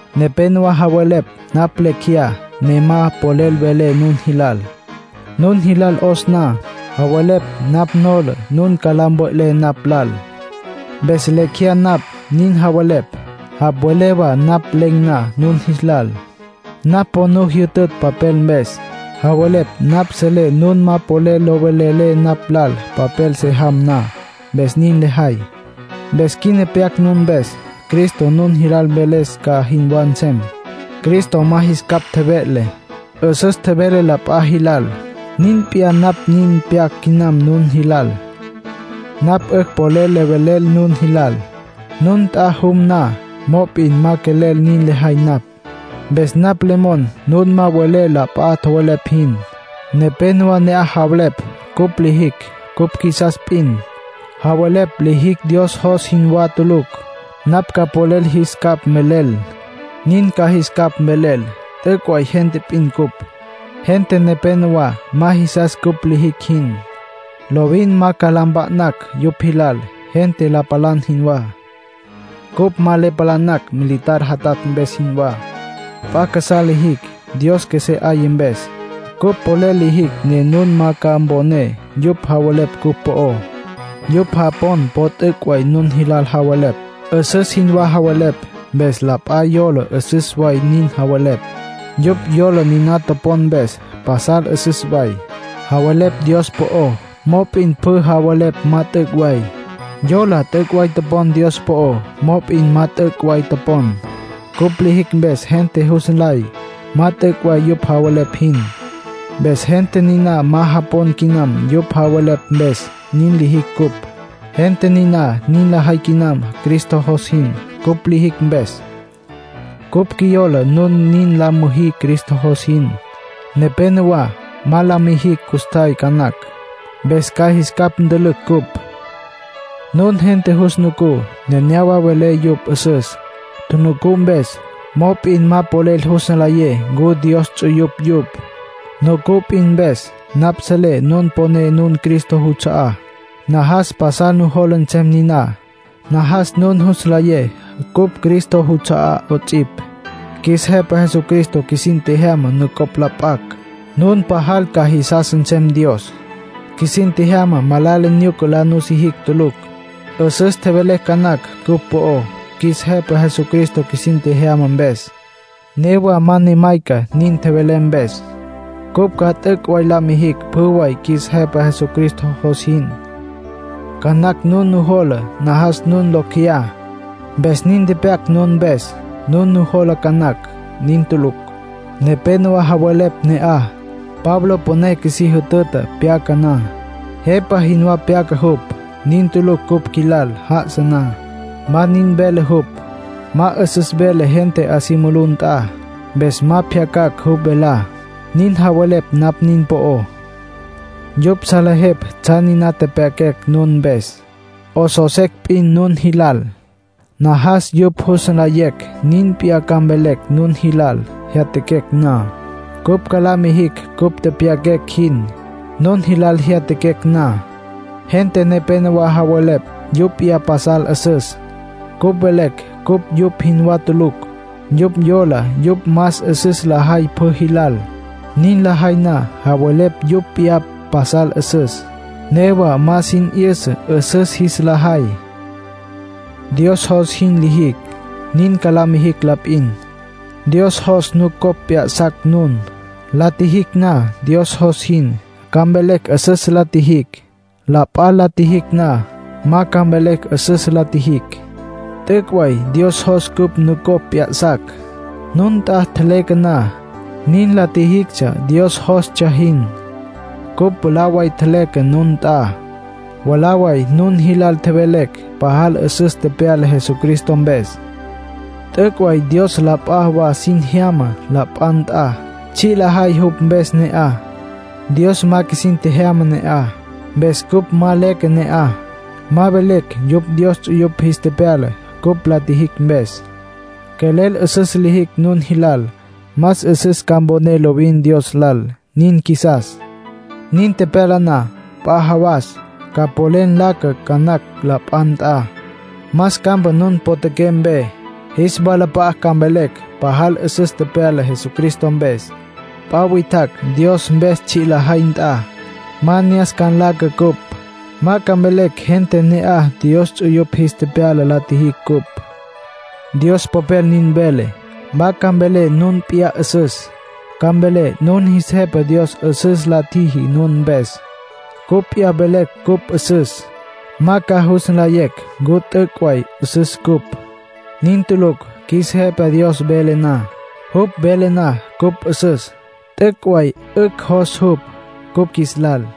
Nepénowa javelepj napj lecj jeyá, ne ma polel velé nun jilal, nun jilal 'os na. Javelepj napj nola nun ca la mve'lé napj lal, mpes lecj jeyá napj, nin javelepj. Javelepj wa napj len̈ na nun jilal, napj po nu jyütütj papel mpes. Javelepj napj selé nun ma polel lo velelé napj lal papel se jam na, mpes nin lejay. Mpes quina pyac nun mpes, Cristo nun jilal mveles ca jinwá nsem. Cristo ma jis capj tjeve'le. 'Üsüs tjevele la p'a jilal. Nin p'iyá napj nin pyac quinam nun jilal. Napj 'ücj polel le velel nun jilal, nun nt'a jum na. Mop'in ma quelel nin lejay napj. Mpes napj le mon nun ma welé la p'a tjowelepj jin. Nepénowa ne'aj javelepj cupj lijicj cupj qjuisas p'in. Javelepj lijicj Dios jos jinwá tulucj. Napj ca polel jis capj mvelel, nin ca jis capj mvelel. T'üc' way gente p'in cupj. Gente nepénowa ma jisas cupj lijicj jin. Lovin ma ca la mpa'nacj yupj jilal, gente la palan jinwá. Cupj ma le palanacj militar jatatj mpes jinwá. P'a casá lijicj. Dios qjuesé 'aya mpes, cupj polel lijicj ne nun ma ca mponé yupj javelepj cupj po'ó. Yupj japon po t'üc' way nun jilal javelepj. 'Üsüs jinwá javelepj, mpes la p'a yola 'üsüs way nin javelepj. Yupj yola niná topon mpes pasal 'üsüs way. Javelepj Dios po'ó, mop'in pjü javelepj ma t'üc' way. Yola t'üc' way topon Dios po'ó, mop'in ma t'üc' way topon. Cupj lijicj mpes gente jus nlay ma t'üc' way yupj javelepj jin. Mpes gente niná ma japon quinam yupj javelepj mpes, nin lijicj cupj. Gente niná nin lajay quinam Cristo jos jin, cupj lijicj mpes. Cupj qjuiyola nun nin la müjí Cristo jos jin. Nepénowa ma la mijicj custjay ca nacj, mpes ca jis capj ntülücj cupj. Nun gente yus nucú, nenéyawa welé yupj 'üsüs, tjunucú mpes. Mop'in ma polel jus nlayé ncu Dios ts'uyupj yupj, nucú p'in mpes. Napj selé nun poné nun Cristo juts'a'á. Najas pasal nujola nsem niná, najas nun jus nlayé cupj Cristo juts'a'á 'ots'ipj. Qjuis Jepa Jesucristo qjuisin tjejyama nucopj la p'acj, nun pajal ca jisas nsem Dios. Qjuisin tjejyama malala nyuca la nusijicj tulucj. 'Üsüs tjevelé ca nacj cupj po'ó, qjuis Jepa Jesucristo qjuisin tjejyama mpes. Newa ma ne mayca nin tjevelé mpes; cupj ca t'üc' la mijicj pjü way qjuis Jepa Jesucristo jos jin. Ca nacj nun nujola najas nun locj jeyá, mpes nin tepyac nun mpes, nin nujola ca nacj. Nin tulucj. Nepénowa javelepj ne'aj: “Pablo püné qjuisí jütüta pyaca na. Jepa jinwá pyaca jupj. Nin tulucj cupj qjuilal já'asa na; ma nin vele jupj. Ma 'üsüs vele gente 'a si mulú nt'a, mpes ma pjyacan̈ jupj velá”, nin javelepj napj nin po'ó. Yupj salejepj tsjan niná tepyaquecj nun mpes, 'osos secj p'in nun jilal. Najas yupj jus nlayecj nin p'iyá ca mvelecj nun jilal jyatjaquecj na. Cupj ca la mijicj cupj tepyaquecj jin, nun jilal jyatjaquecj na. Gente nepénowa javelepj yupj p'iyá pasal 'üsüs. Cupj velecj cupj yupj jinwá tulucj. Yupj yola yupj más 'üsüs lajay pjü jilal. Nin lajay na, javelepj yupj p'iyá pasal 'üsüs. Newa ma sin 'yüsa 'üsüs jis la jay. Dios jos jin lijicj, nin ca la mijicj la p'in. Dios jos nucopj p'ya'sacj nun. La tjijicj na Dios jos jin, ca mvelecj 'üsüs la tjijicj. La p'a la tjijicj na, ma ca mvelecj 'üsüs la tjijicj. T'üc' way Dios jos cupj nucopj p'ya'sacj. Nun nt'a tjeleque na, nin la tjijictsja Dios jostsja jin. Cupj mwalá way tjeleque nun nt'a. Mwalá way nun jilal tjevelecj pajal 'üsüs tepyala Jesucristo mpes. T'üc' way Dios la p'a wa sin jyama la p'a nt'a, tsji' lajay jupj mpes ne'aj. Dios ma qjuisin tjejyama ne'aj. Mpes cupj ma leque ne'aj, ma velecj yupj Dios ts'uyupj jis tepyala cupj la tjijicj mpes. Quelel 'üsüs lijicj nun jilal, más 'üsüs ca mponé lovin Dios lal; nin qjuisas. Nin tepyala na, p'a jawas ca polel nlaca ca nacj la p'a nt'a, más campa nun potjaqué mpe. Jis walap'a'a ca mvelecj pajal 'üsüs tepyala Jesucristo mpes. P'a witjacj Dios mpes tsji' lajay nt'a, ma ne'as ca nlaca cupj. Ma ca mvelecj gente ne'aj Dios ts'uyupj jis tepyala la tjijicj cupj. Dios Popel nin vele: “Ma ca mvelé nun p'iyá 'üsüs; ca mvelé nun jis Jepa Dios 'üsüs la tjiji nun mpes”. Cupj p'iyá velecj cupj 'üsüs, ma ca jus nlayecj ncu t'üc' way 'üsüs cupj. Nin tulucj qjuis Jepa Dios vele na. Jupj vele na cupj 'üsüs, t'üc' way 'ücj jos jupj cupj qjuis lal.